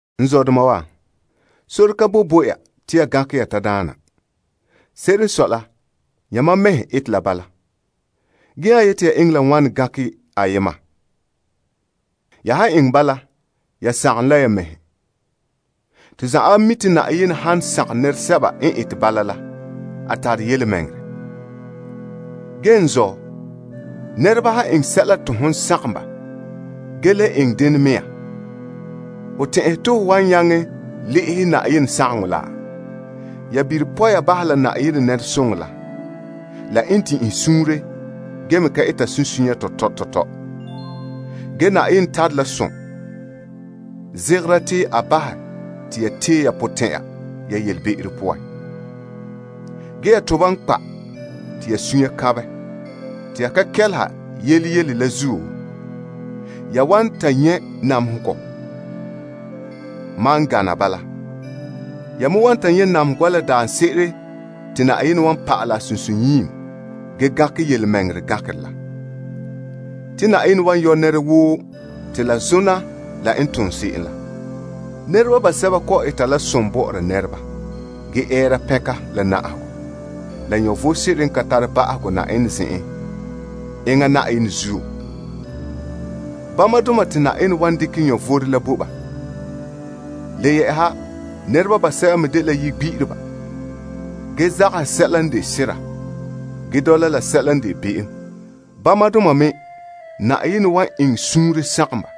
N zɔdoma wa, sore ka boe bo ya te ya gankɛ ya tadaana. Se'ere n sɔe la yamam mɛhe n ete la bala. Ge nya yeti ya eŋɛ la wane gankɛ ayema. Ya han eŋɛ bala, ya sagom ne la ya mɛhe. To zanwaabe mi' te Yenɛ han sagom nɛresɛba n ete bala la, a tare yelemɛŋɛrɛ. Ge n zɔ', nɛreba han eŋɛ sɛla te hon sagom ba ge le eŋɛ dene mea, ho tɛn'ɛhe te ho wan nyaŋɛ le'ehɛ Yenɛ sagaŋɔ la? Ya bire poya bahɛ Yenɛ nɛresoŋɔ la, la n din'inhe suunre ge me ka eta sunsunya tɔtɔ tɔtɔ la. Ge, Yenɛ tare la som, zegera te a bahɛ te ya tee ya potɛn'ya ya yelebe'ero poan. Ge ya toba n kpa' te ya sunya kanbɛ te ya ka kɛleha yele yele la zuo, ya wan ta nyɛ' namehegɔ gaŋɛ. Namehegɔ daarɛ la te Yenɛ wan pa'alɛ a sunsunyiim ge gankɛ yelemɛŋɛrɛ gankerɛ la. Te Yenɛ wan yɔ' nɛra woo te la zona la n tom se'em la. Nɛreba basɛba kɔ'ɔn eta la som bɔ'ɔra nɛreba ge ɛɛra pɛnka la na'ahegɔ, la vom sebo n ka tare ba'ahegɔ Yenɛ zen'en enŋa Yenɛ zuo. Bamadoma te Yenɛ wan dekɛ vom la bo ba. Le yɛ'ɛha nɛreba basɛba me dela ponya'andoma ge zagahɛ sɛla n de sera, ge dɔla la sɛla n de be'em. Bamadoma me Yenɛ wan eŋɛ suunre sagom ba.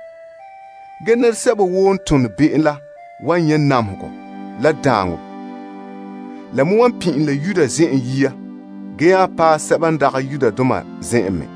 Ge nɛresɛba woo n tone be'em la wan nyɛ' namehegɔ la daaŋɔ. La me wan pin'ilom la Yudoma zen'an yia ge nya paɛ sɛba n dagɛ Yudoma zen'an me.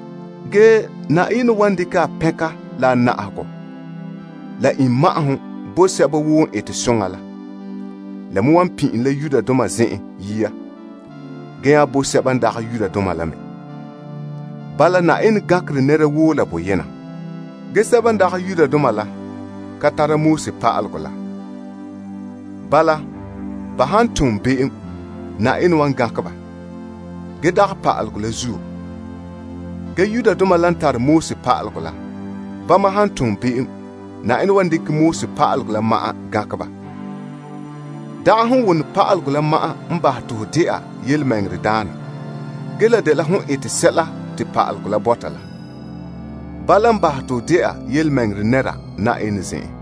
Ge Yenɛ wan dekɛ a pɛnka la a na'ahegɔ la iŋma'ahom bo sɛba woo n eta soŋa la. La me wan le pin'ilom la Yudoma zen'enhe yia ge nya bo sɛba n dagɛ Yudoma la me. Bala Yenɛ gankerɛ nɛra woo la boyena. Nɛresɛba n ka tare pa'alegɔ la, han ton be'em, Yenɛ kan gankɛ ba la pa'alegɔ la. Ge nɛresɛba n tare pa'alegɔ la, han ton be'em, Yenɛ wan dekɛ pa'alegɔ gankɛ ba. Dagɛ se'em wone pa'alegɔ la ma'an n bahɛ te ho de'a yelemɛŋɛrɛdaana ge la dela hon ete sɛla te pa'alegɔ la bɔta la, eŋɛ bahɛ te ho de'a yelemɛŋɛrɛ nɛra Yenɛ zen'en.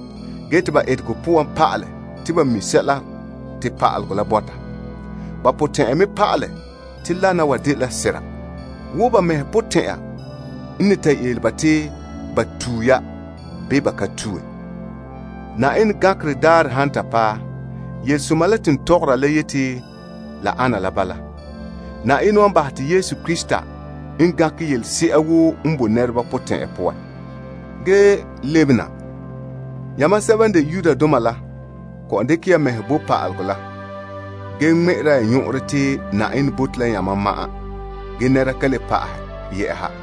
Ge te ba etegɔ poan pa'alɛ te ba mi' sɛla te pa'alegɔ la bɔta. Ba potɛn'ya me pa'alɛ te lana wa dela sera wo ba mɛhe potɛn'ya n ne ta yele ba te ba tue ya bii ba ka tue. Yenɛ gankerɛ daarɛ han ta paɛ, yelesoma la te n tɔgɔra la yete la ana la bala. Yenɛ wan bahɛ te Yesu Krista n gankɛ yelese'a woo n boe nɛreba potɛn'ya poan. Ge lebena, yamam sɛba han de Yudoma la kɔ'ɔn dekɛ ya mɛhe bo pa'alegɔ la, ge ŋmɛ'ɛra ya nyɔn'ɔnrɔ te Yenɛ bote la yamam ma'an ge nɛra ka le pa'ahɛ yɛ'ɛha,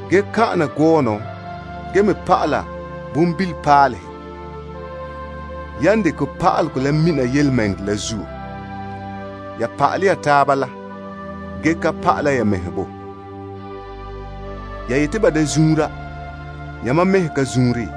ya han kan'an na gɔɔnɔ ge me pa'ala bonbilipaalehe ya n dekɛ pa'alegɔ la mina yelemɛŋɛrɛ la zuo, ya se'em n pa'alɛ ya taaba la, bene te ya ka pa'ala ya mɛhe? Ya yeti ba da zuunra, yamam mɛhe ka zuunre?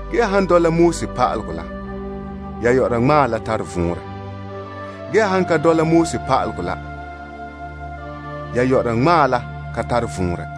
Ge ya han dɔla pa'alegɔ la ya ŋmaa la tare vɔnrɛ, ge ya han ka dɔla pa'alegɔ la ya ŋmaa la ka tare vɔnrɛ.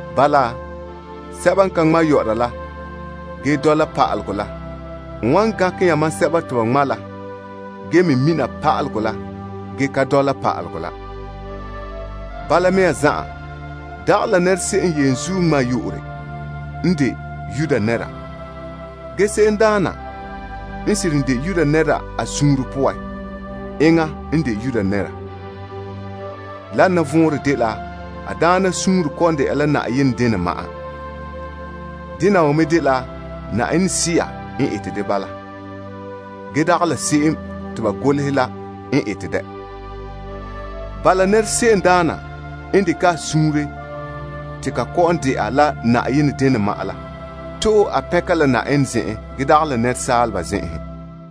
Bala, se'em n ka ŋma' la ge dɔla pa'alegɔ la wan gankɛ yamam sɛba te ba ŋma' la ge me mina pa'alegɔ la ge ka dɔla pa'alegɔ la. Bala mea zan'an, dagɛ la nɛra se'em n yenzuo ŋmaa n de Yuda nɛra. Ge, se'emdaana n seren de Yuda nɛra a suunre poan, enŋa n de Yuda nɛra. Wana vɔnrɛ dela a daana suunre kɔ'ɔn de'a la Yenɛ denɛ ma'an. Dena wa me dela Yenɛ Sea n ete de bala, ge dagɛ pa'alegɔ te ba golehɛ la n ete dɛ. Bala, nɛra se'emdaana n dekɛ a suunre te ka kɔ'ɔn de'a la Yenɛ denɛ ma'an la, to'ohe a pɛnka la Yenɛ zen'an ge dagɛ la nɛresaaleba zen'enhen.